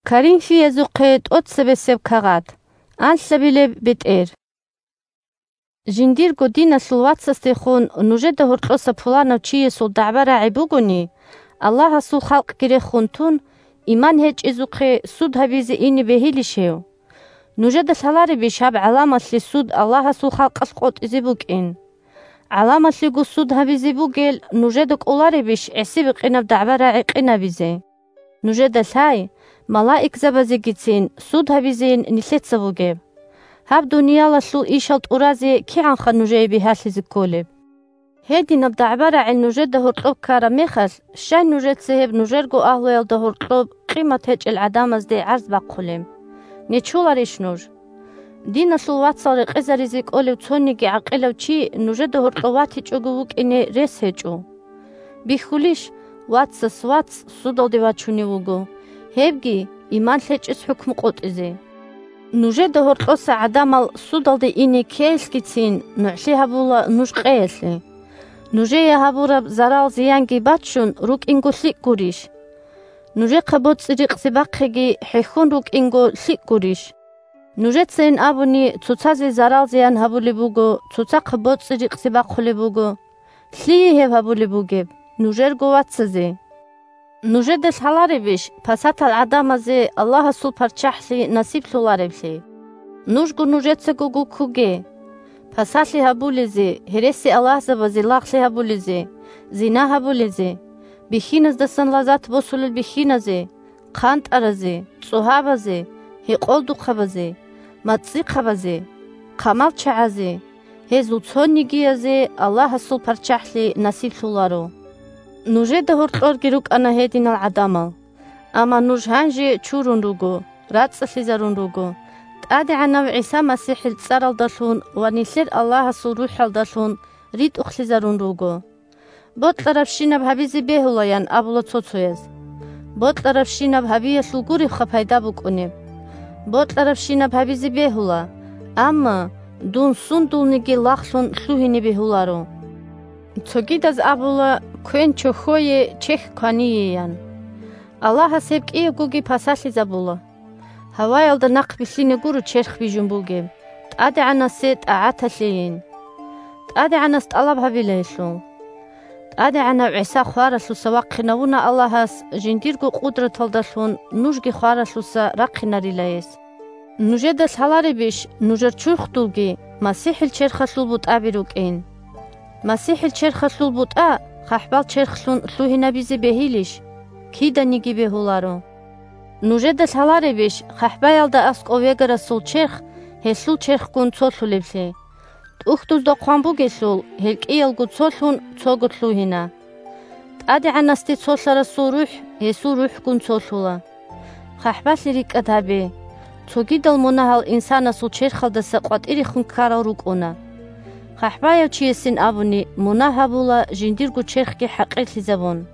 Иман лъурал цоцаз судалде щай ахӀулел? Жиндирго диналъул вацасдехун нужеда гьоркьоса пуланав чиясул дагӀба-рагӀи бугони, Аллагьасул халкъги рехун тун, иман гьечӀезухъе суд гьабизе ине бегьилищ гьев? Нужеда лъаларебищ гьаб гӀаламалъе суд Аллагьасул халкъалъ къотӀизе букӀин? ГӀаламалъего суд гьабизе бугел нужеда кӀоларебищ гӀиси-бикъинаб дагӀба-рагӀи къинабизе? Нужеда лъай: малаикзабазегицин суд гьабизейин нилъеца бугеб. Гьаб дуниялалъул ишал тӀуразе кигӀанха нужее бигьалъизе кколеб! Гьединаб дагӀба-рагӀи нужеда гьоркьоб ккараб мехалъ, щай нужеца гьеб нужерго агьлуялда гьоркьоб къимат гьечӀел гӀадамазде гӀарз бахъулеб? Нечоларищ нуж? Диналъул вацал рекъезаризе кӀолев цониги гӀакъилав чи нужеда гьоркьов ватичӀого вукӀине рес гьечӀо. Бихьулищ – вацас вац судалде вачунев вуго, гьебги – иман лъечӀез хӀукму къотӀизе. Нужеда гьоркьоса гӀадамал судалде ине ккеялъгицин нугӀлъи гьабула нуж къеялъе. Нужее гьабураб зарал-зиянги баччун рукӀинго лъикӀ гурищ? Нужехъа боцӀи-рикъзи бахъиги хӀехьон рукӀинго лъикӀ гурищ? Нужецайин абуни цоцазе зарал-зиян гьабулеб буго, цоцахъа боцӀи-рикъзи бахъулеб буго. Лъие гьеб гьабулеб бугеб? Нужерго вацазе! Нужеда лъаларебищ пасатал гӀадамазе Аллагьасул ПарччахӀлъи насиблъулареблъи? Нужго нужецаго гуккуге! Пасалъи гьабулезе, гьересиаллагьзабазе лагълъи гьабулезе, зина гьабулезе, бихьиназдасан лазат босулел бихьиназе, хъантӀаразе, цӀогьабазе, гьекъолдухъабазе, мацӀихъабазе, хъамалчагӀазе – гьезул цонигиязе Аллагьасул ПарччахӀлъи насиблъуларо. Нужеда гьоркьорги рукӀана гьединал гӀадамал. Амма нуж гьанже чурун руго, рацӀцӀалъизарун руго, ТӀадегӀанав ГӀиса МасихӀил цӀаралдалъун ва нилъер Аллагьасул РухӀалдалъун ритӀухълъизарун руго! «Бокьарабщинаб гьабизе бегьула!» – ян абула цо-цояз. Бокьарабщинаб гьабиялъул гуребха пайда букӀунеб. «Бокьарабщинаб гьабизе бегьула!» Амма дун сундулниги лагълъун лъугьине бегьуларо. Цогидаз абула: «Квен – чохьое, чехь – квание!» – ян. Аллагьас гьеб кӀиябгоги пасалъизабула. Гьаваялда нахъбилълъине гуро черх бижун бугеб, ТӀадегӀанасе тӀагӀаталъейин. ТӀадегӀанас тӀалаб гьабила гьелъул. ТӀадегӀанав ГӀиса хваралъуса вахъинавуна Аллагьас, жиндирго къудраталдалъун нужги хваралъуса рахъинарила гьес. Нужеда лъаларебищ нужер чурхдулги МасихӀил черхалъул бутӀаби рукӀин? МасихӀил черхалъул бутӀа хъахӀбал черхлъун лъугьинабизе бегьилищ? Киданиги бегьуларо! Нужеда лъаларебищ хъахӀбаялда аскӀов вегарасул черх гьелъул черхгун цолъулеблъи? ТӀухьдузда хъван бугелъул: «гьел кӀиялго цолъун, цого лъугьина». ТӀадегӀанасде цолъарасул рухӀ гьесул РухӀгун цолъула. ХъахӀбалъи рикӀкӀад гьабе! Цогидал мунагьал инсанасул черхалдаса къватӀирехун ккарал рукӀуна. ХъахӀбаяв чиясин абуни, мунагь гьабула жиндирго черхги хӀакъирлъизабун.